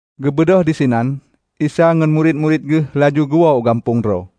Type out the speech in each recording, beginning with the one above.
Geubeudôh disinan, Isa ngon murit-murit Geuh laju geuwoe u gampông droe.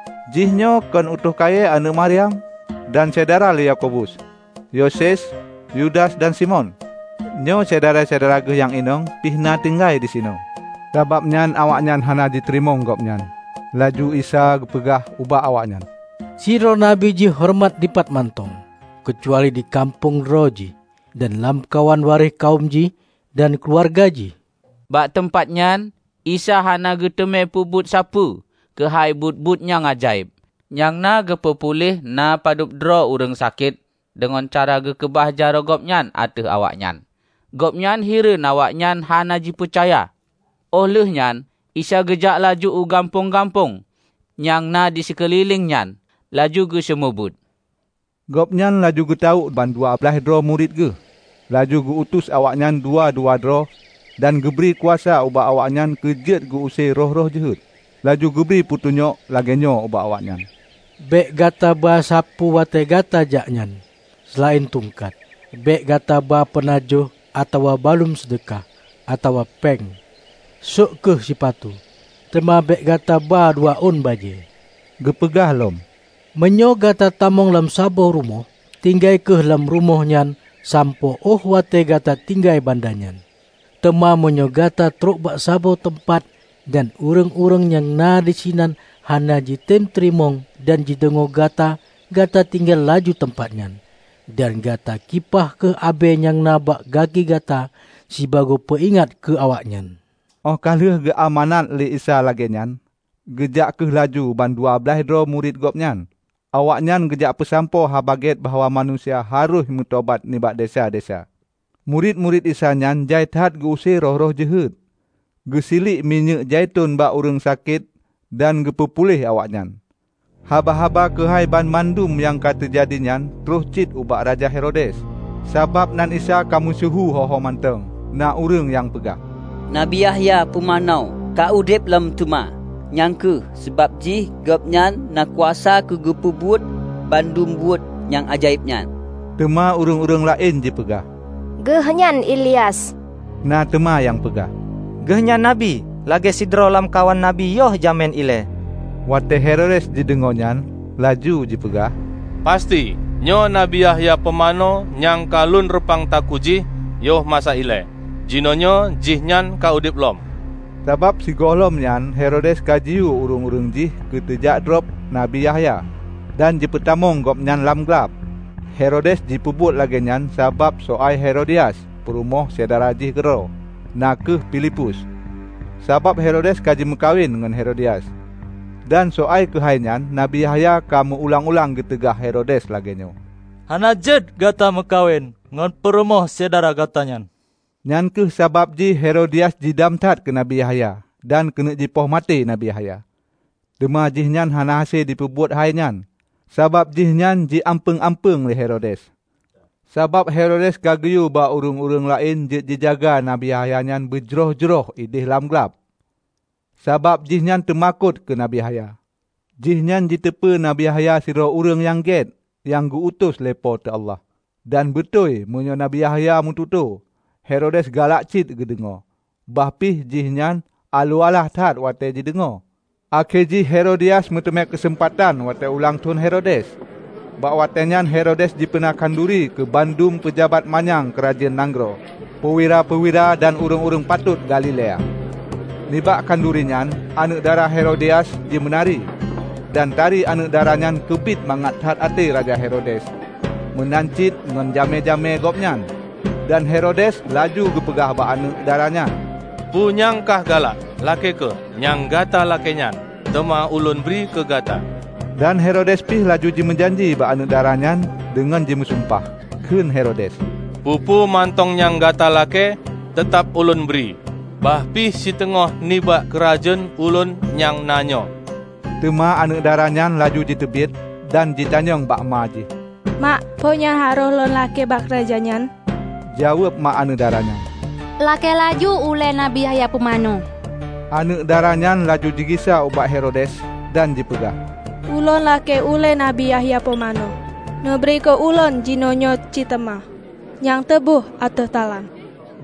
Jihnyoe kon utôh kayée, aneuëk Maryam, dan syedara lé Yakobus, Yoses, Yudas dan Simon? Nyoe, syedara-syedara Geuh nyang inong pih na tinggai disinoe." Sabab nyan awaknyan hana jiteurimong Gobnyan. Laju Isa geupeugah ubak awaknyan, "Sidroe Nabi jihoreumat dipat mantong, keucuali di gampông droe jih, dan lamkawan waréh kawöm jih dan keuluwarga jih." Bak teumpat nyan Isa hana geuteumé peubuet sapeue keuhai buet-buet nyang ajaéb, nyang na geupeu puléh na padub droe ureuëng sakét deungon cara geukeubah jaroe Gobnyan ateueh awaknyan. Gobnyan hireuen awaknyan hana jipeucaya. Óh lheueh nyan Isa geujak laju u gampông-gampông nyang na sikeulileng nyan laju geuseumeubeuet. Gobnyan laju geutawök ban dua blaih droe murit Geuh, laju geu utus awaknyan dua-dua droe dan geubri kuasa ubak awaknyan keu jeuet geu-use roh-roh jeuhet. Laju geubri peutunyok lagée nyoe ubak awaknyan, "Bék gata ba sapeue watée gata jak nyan, seulaén tungkat. Bék gata ba peunajoh atawa baluem seudeukah, atawa péng. Sôk kheueh sipatu, teuma bék gata ba dua ôn bajée." Geupeugah lom, "Meunyoe gata tamong lam saboh rumoh, tinggai kheueh lam rumoh nyan sampoe óh watée gata tinggai banda nyan. Teuma meunyoe gata troh bak saboh teumpat, dan ureuëng-ureuëng nyang na disinan hana jitem teurimong dan jideungoe gata, gata tinggai laju teumpat nyan. Dan gata kipah kheueh abée nyang na bak gaki gata sibagoe peu ingat keu awaknyan!" Óh ka lheueh geu amanat lé Isa lagée nyan, geujak kheueh laju ban dua blaih droe murit Gobnyan nyan. Awaknyan geujak peusampoe haba gét bahwa manusia harôh meutobat nibak desya-desya. Murit-murit Isa nyan jai that geu-use roh-roh jeuhet, geusiliek minyéuk zaiton bak ureuëng sakét dan geupeu puléh awaknyan. Haba-haba keuhai banmandum nyang ka teujadi nyan troh cit ubak Raja Herodes, sabab nan Isa ka meusyeuhu ho-ho mantong. Na ureuëng nyang peugah, "Nabi Yahya Pumanö ka udeb lom teuma! Nyang kheueh sabab jih Gobnyan na kuasa keu geupeubuet bandum buet nyang ajaéb nyan." Teuma ureuëng-ureuëng laén jipeugah, "Geuh nyan Ilyas." Na teuma nyang peugah, "Geuh nyan Nabi, lagée sidroe lam kawan Nabi yoh jamén ilée." Watée Herodes jideungoe nyan, laju jipeugah, "Pasti nyoe Nabi Yahya Pumanö nyang ka lôn reupang takue jih yoh masa ilée. Jinoenyoe jihnyan ka udeb lom!" Sabab sigohlom nyan Herodes ka jiyue ureuëng-ureuëng jih keuteujak drob Nabi Yahya, dan jipeutamong gobnyan lam glab. Herodes jipeubuet lagée nyan sabab soai Herodias, peurumoh syedara jih keudroe, na kheueh Filipus. Sabab Herodes ka geumeukawen ngon Herodias, dan soai keuhai nyan Nabi Yahya ka meu ulang-ulang geuteugah Herodes lagée nyoe, "Hana jeuet gata meukawen ngon purumoh syedara gata nyan!" Nyang kheueh sabab jih Herodias jidam that keu Nabi Yahya dan keuneuk jipoh maté Nabi Yahya, teuma jihnyan hana hase jipeubuet hai nyan, sabab jihnyan ji ampeueng-ampeueng lé Herodes. Sabab Herodes ka geuyue bak ureuëng laén jeuet jijaga Nabi Yahya nyan beujroh-jroh ideh lam glab, sabab jihnyan teumakot keu Nabi Yahya. Jihnyan jiteupeu Nabi Yahya sidroe ureuëng gét nyang geu-utus lé Po teu Allah. Dan beutôi, meunyoe Nabi Yahya geumeututoe, Herodes galak cit jideungoe, bah pih jihnyan aloh alah that watée jideungoe. Akhé jih Herodias meuteumé keuseumpatan watée ulang thon Herodes. Bak watéenyan Herodes jipeuna khanuri keu banmandum peujabat manyang keurajeuen nanggroe, peuwira-peuwira dan ureuëng-ureuëng patot Galilea. Nibak khanuri nyan aneuëk dara Herodias jimeunari, dan tari aneuëk dara nyan keubiet mangat that até raja Herodes meunan cit ngon jamé-jamé gobnyan. Dan Herodes laju jipeugah bak aneuëk dara nyan, "Peue nyang kah galak, lakée kheueh. Nyang gata lakéenyan teuma ulôn bri keu gata!" Dan Herodes pih laju jimeujanji bak aneuëk dara nyan deungon jimeusumpah. Kheun Herodes, "Peue-peue mantong nyang gata lakée teutab ulôn bri, bah pih siteungoh nibak keurajeuen ulôn nyang na nyoe!" Teuma aneuëk daranyan laju jiteubiet dan jitanyong bak ma jih, "Mak, peue nyang harôh lôn lakée bak raja nyan?" Jaweueb mak aneuëk dara nyan, "Lakée laju ulée Nabi Yahya Pumanö." Aneuëk dara nyan laju jigisa ubak Herodes dan jipeugah, "Ulôn lakée ulée Nabi Yahya Pumanö neubri keu ulôn jinoenyoe cit teuma nyang teuboh ateueh talam!"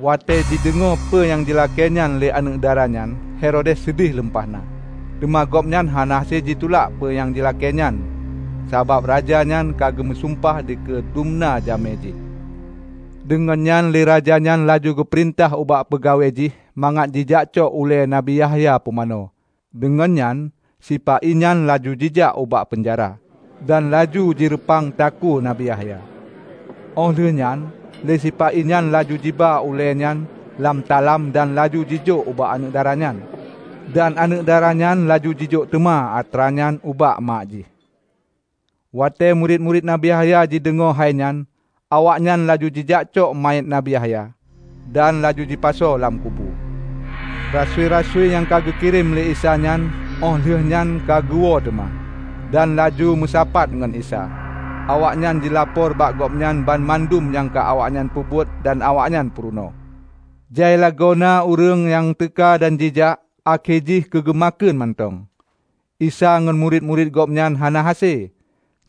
Watée jideungoe peue nyang jilakéenyan lé aneuëk dara nyan Herodes seudeh lumpah na. Teuma gobnyan hana hase jitulak peue nyang jilakéenyan sabab raja nyan ka jimeusumpah dikeue dum na jamé jih. Deungon nyan lé raja nyan laju jipeurintah ubak peungawai jih mangat jijakcok ulée Nabi Yahya Pumanö. Deungon nyan, sipa-i nyan laju jijak ubak peunjara, dan laju jireupang takue Nabi Yahya. Óh lheueh nyan lé sipa-i nyan laju jiba ulée nyan lam talam dan laju jijok ubak aneuëk dara nyan. Dan aneuëk daranyan laju jijok teuma atra nyan ubak mak jih. Watée murit-murit Nabi Yahya jideungoe hai nyan, awaknyan laju jijak cok manyét Nabi Yahya, dan laju jipasoe lam kubu. Rasui-rasui nyang geukirém lé Isa nyan óh lheueh nyan ka geuwoe teuma, dan laju meusapat ngon Isa. Awaknyan jilapor bak Gobnyan banmandum nyang ka awaknyan peubuet dan awaknyan peurunoe. Jai lagoena ureuëng nyang teuka dan jijak, akhé jih keugeu makheun mantong Isa ngon murit-murit Gobnyan hana hase.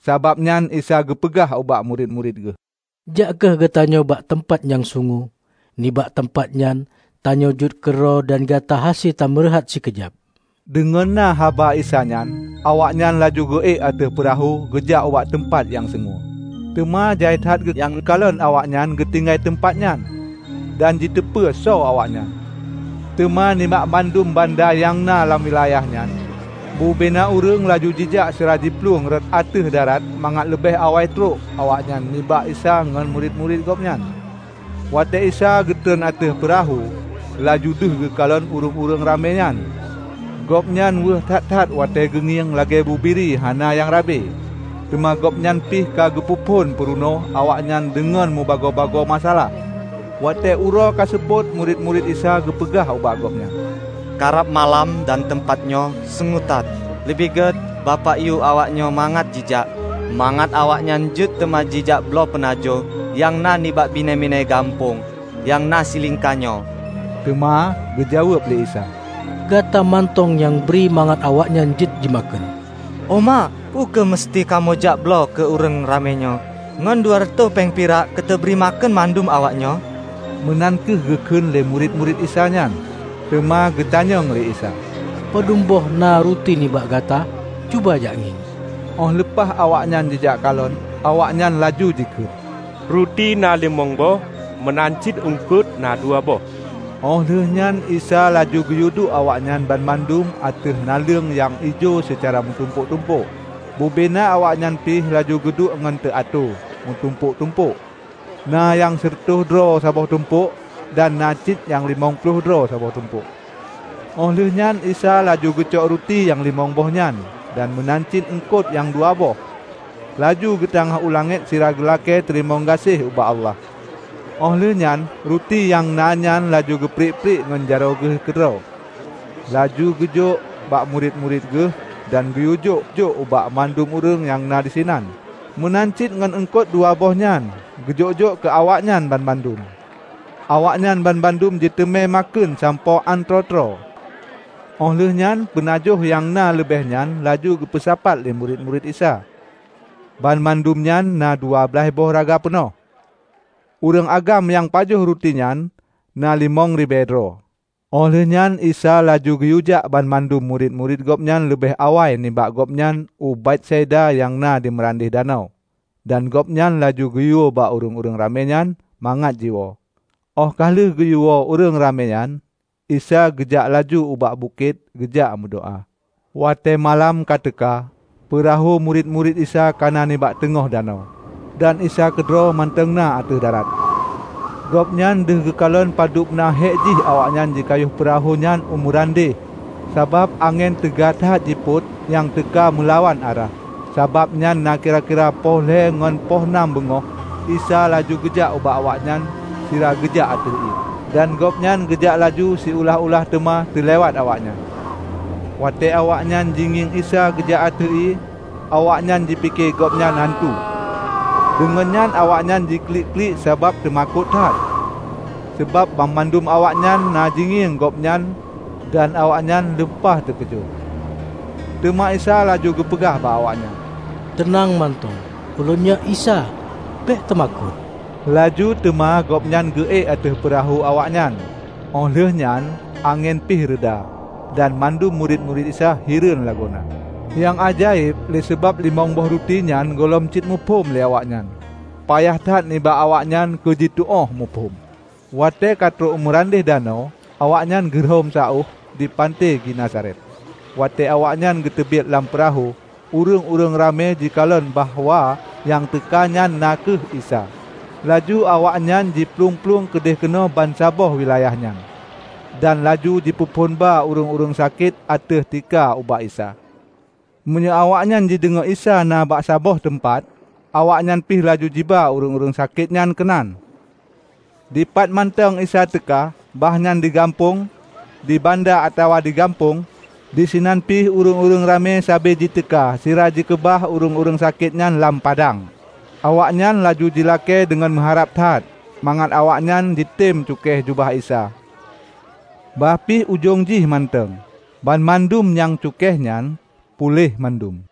Sabab nyan Isa geupeugah ubak murit-murit Geuh, "Jak kheueh geutanyoe bak teumpat nyang sungue, nibak teumpat nyan tanyoe jeuet keudroe dan gata hase tameureuhat sikeujab." Deungon na haba Isa nyan, awaknyan laju geu-ék ateueh peurahô geujak ubak teumpat nyang sungue. Teuma jai that nyang kalon awaknyan geutinggai teumpat nyan, dan jiteupeu soe awaknyan. Teuma, nibak mandum banda nyang na lam wilayah nyan, bubena ureuëng laju jijak sira jiplueng rot ateueh darat mangat leubeh awai trok awaknyan nibak Isa ngon murit-murit Gobnyan. Watée Isa geutreun ateueh peurahô, laju deuh geukalon ureuëng ramé nyan. Gobnyan weueh that-that watée geungieng, lagée bubiri hana nyang rabe. Teuma Gobnyan pih ka geupeu phon peurunoe awaknyan deungon mubagoe masa-alah. Watée uroe ka seupôt, murit-murit Isa geupeugah ubak Gobnyan, "Karab malam dan teumpat nyoe sungue that. Leubeh gét bapak yue awaknyoe mangat jijak, mangat awaknyan jeuet teuma jijak bloe peunajoh nyang na nibak binéh-binéh gampông nyang na silingka nyoe." Teuma geujaweueb lé Isa, "Gata mantong nyang bri mangat awaknyan jeuet jimakheun" "O ma, peu kheueh museuti kamoe jak bloe keu ureuëng ramé nyoe ngon dua reutoh péng pirak keuteubri makheun mandum awaknyoe?" meunan kheueh geukheun lé murit-murit Isa nyan. Teuma geutanyong lé Isa, "Padub boh na ruti nibak gata? Cuba jak ngieng." Oh leupah awaknyan jijak kalon, awaknyan laju jikheun, "Ruti na limong boh meunan cit eungkot na dua boh." Oh lheueh nyan Isa laju geuyue duek awaknyan banmandum ateueh naleueng nyang ijo seucara meutumpôk-tumpôk. Bubena awaknyan pih laju geuduek ngon teuatoe, meutumpôk-tumpôk. Na nyang sireutôh droe saboh tumpok, dan na cit nyang limong ploh droe saboh tumpok. Óh lheuehnyan Isa laju geucok ruti nyang limong boh nyan dan meunan cit eungkot nyang dua boh, laju geutangáh u langét sira geulakée teurimong gaséh ubak Allah. Óh lheueh nyan, ruti nyang na nyan laju geupriek-priek ngon jaroe Geuh keudroe laju geujok bak murit-murit Geuh dan geuyue jok-jok ubak mandum ureuëng nyang na disinan. Meunan cit ngon eungkot dua boh nyan geujok-jok keu awaknyan banmandum. Awaknyan banmandum jiteumé makheun sampoe án troe-troe. Óh lheueh nyan peunajoh nyang na leubeh nyan laju geupeusapat lé murit-murit Isa -- banmandum nyan na dua blaih boh raga peunoh. Ureuëng agam nyang pajoh ruti nyan na limong ribée droe. Óh lheueh nyan Isa laju geuyue jak banmandum murit-murit Gobnyan leubeh awai nibak gob nyan u Betsaida nyang na di meurandeh danau, dan Gobnyan laju geuyue bak ureuëng ramé nyan mangat jiwoe. Óh ka lheueh geuyue woe ureuëng ramé nyan, Isa geujak laju ubak bukét keugeujak meudoá. Watée malam ka teuka, peurahô murit-murit Isa kana nibak teungoh danau, dan Isa keudroe mantong na ateueh darat. Gobnyan deuh geukalon padub na hek jih awaknyan jikayoh peurahô nyan u meurandeh sabab angén teuga that jipot nyang teuka meulawan arah. Sabab nyan, na kira-kira poh lhée ngon poh nam beungoh, Isa laju geujak ubak awaknyan sira geujak ateueh ié. Dan gobnyan geujak laju siulah-ulah teuma teulewat awaknyan. Watée awaknyan jingieng Isa geujak ateueh ié, awaknyan jipike Gobnyan antu, deungon nyan awaknyan jiklik-klik sabab teumakot that. Sabab banmandum awaknyan na jingieng gobnyan dan awaknyan lumpah teukeujot. Teuma Isa laju geupeugah bak awaknyan, "Teunang mantong! Ulôn nyoe Isa, bék teumakot!" Laju teuma Gobnyan geu-ék ateueh peurahô awaknyan, óh lheueh nyan angén pih reuda dan mandum murit-murit Isa hireuen lagoena. Nyang ajaéb le sabab limong boh ruti nyan gohlom cit muphom lé awaknyan, payah that nibak awaknyan keujituóh muphom. Watée katrok u meurandeh danau, awaknyan geurhom saôh di panté Genesaret. Watée awaknyan geuteubiet lam peurahô, ureuëng-ureuëng ramé jikalon bahwa nyang teuka nyan na kheueh Isa. Laju awaknyan jiplueng-plueng keudeh keunoe bansaboh wilayahnyan, dan laju jipeuphon ba ureuëng-ureuëng sakét ateueh tika ubak Isa. Meunyoe awaknyan jideungoe Isa na bak saboh teumpat, awaknyan pih laju jiba ureuëng-ureuëng sakétnyan keunan. Dipat mantong Isa teuka -- bahnyan di gampông, di banda atawa di gampông -- disinan pih ureuëng-ureuëng ramé sabe jiteuka sira jikeubah ureuëng-ureuëng sakét nyan lam padang. Awaknyan laju jilakée deungon meuharab that mangat awaknyan jitem cukéh jubah Isa, bahpi ujong jih mantong. Banmandum nyang cukéh nyan, puléh mandum.